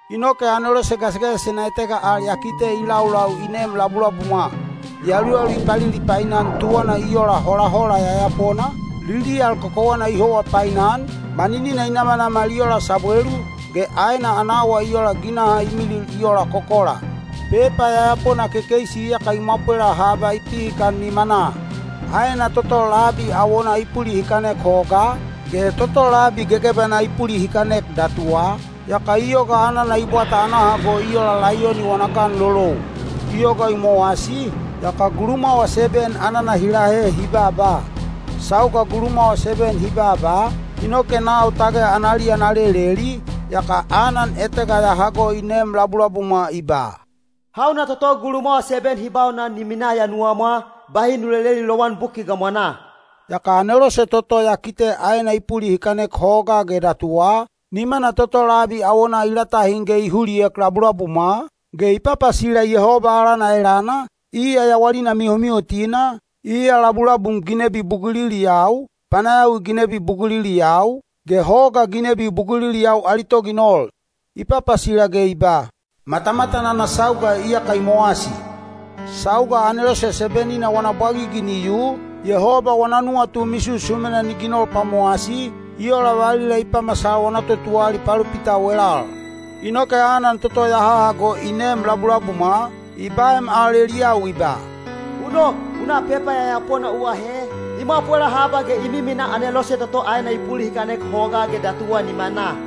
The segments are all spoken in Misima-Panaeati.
Inoke anelose gasigasisena etega al ya kite i laulau i neem labulabumwa. Yaluyalu i palilipainan tuwanaa i ola holahola yayapona, liliyal kokowana i howa painan, maninina i namanamal i ola sabwelu, ge aena ana awa i ola ginaha i milil i ola kokola. Pepa yayapona kekeisi iyaka i mwapwela haba i pihikan nimanaa. Aena toto labi awonaa i pulihikanek hogaa, ge toto labi gegebanaa i pulihikanek datuwa, yaka i yoga anana i bwata ana hago i ola laiyoni wana ganlolou. I yoga i mowasi, yaka gulumwawa seben anana hi lahe hi baaba. Sauga gulumwawa seben hi baaba, inoke nau tage analiya na leleli, yaka anan etega ya hago i neem labulabumwa i ba, “Hauna toto gulumwawa seben hi baunan ni minaa ya nuwamwa, bahi nu leleli lowan buki gamwanaa.” Yaka anelose toto ya kite aena i pulihikanek hogaa ge datuwa, nimana toto labi awonaa i latahin ge i huliek labulabumwa, ge i papasila Yehoba alana elana, iya yawalina mihomihotina, iya labulabum ginebi buguliliyau, panayawi ginebi buguliliyau, ge hoga ginebi buguliliyau ali toginol. I papasila ge i ba, “Matamatan ana sauga iyaka i mowasi! Sauga anelose seben-ina wana bwagigi ni yu, Yehoba wana nuwatu misusumena ni ginol pwamowasi, i ola valila i pamasal wana totuwalali palopitau elal.” Inoke anan toto ya hahago i neem labulabumwa, i baem al eliyau i ba, “U nok, u na pepa yayapona u ahe, i mwapwela haba ge i miminaa anelose toto aena i pulihikanek hogaa ge datuwa nimanaa.”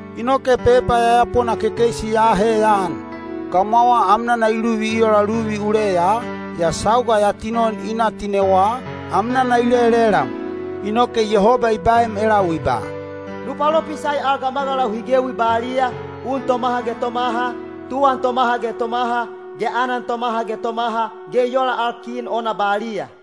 Inoke pepa yayapona kekeisi ya ahe ya an. Gamwawa amnana i luvi i ola luvi uleya, yaa sauga ya tinon i na tinewa, amnana i lelelam. Inoke Yehoba i baem elau i ba, “Nu palopisai al gamagalau hi gewi baliya, un tomaha ge tomaha, tuwan tomaha ge tomaha, ge anan tomaha ge tomaha, ge i ola al kin ona baliya.”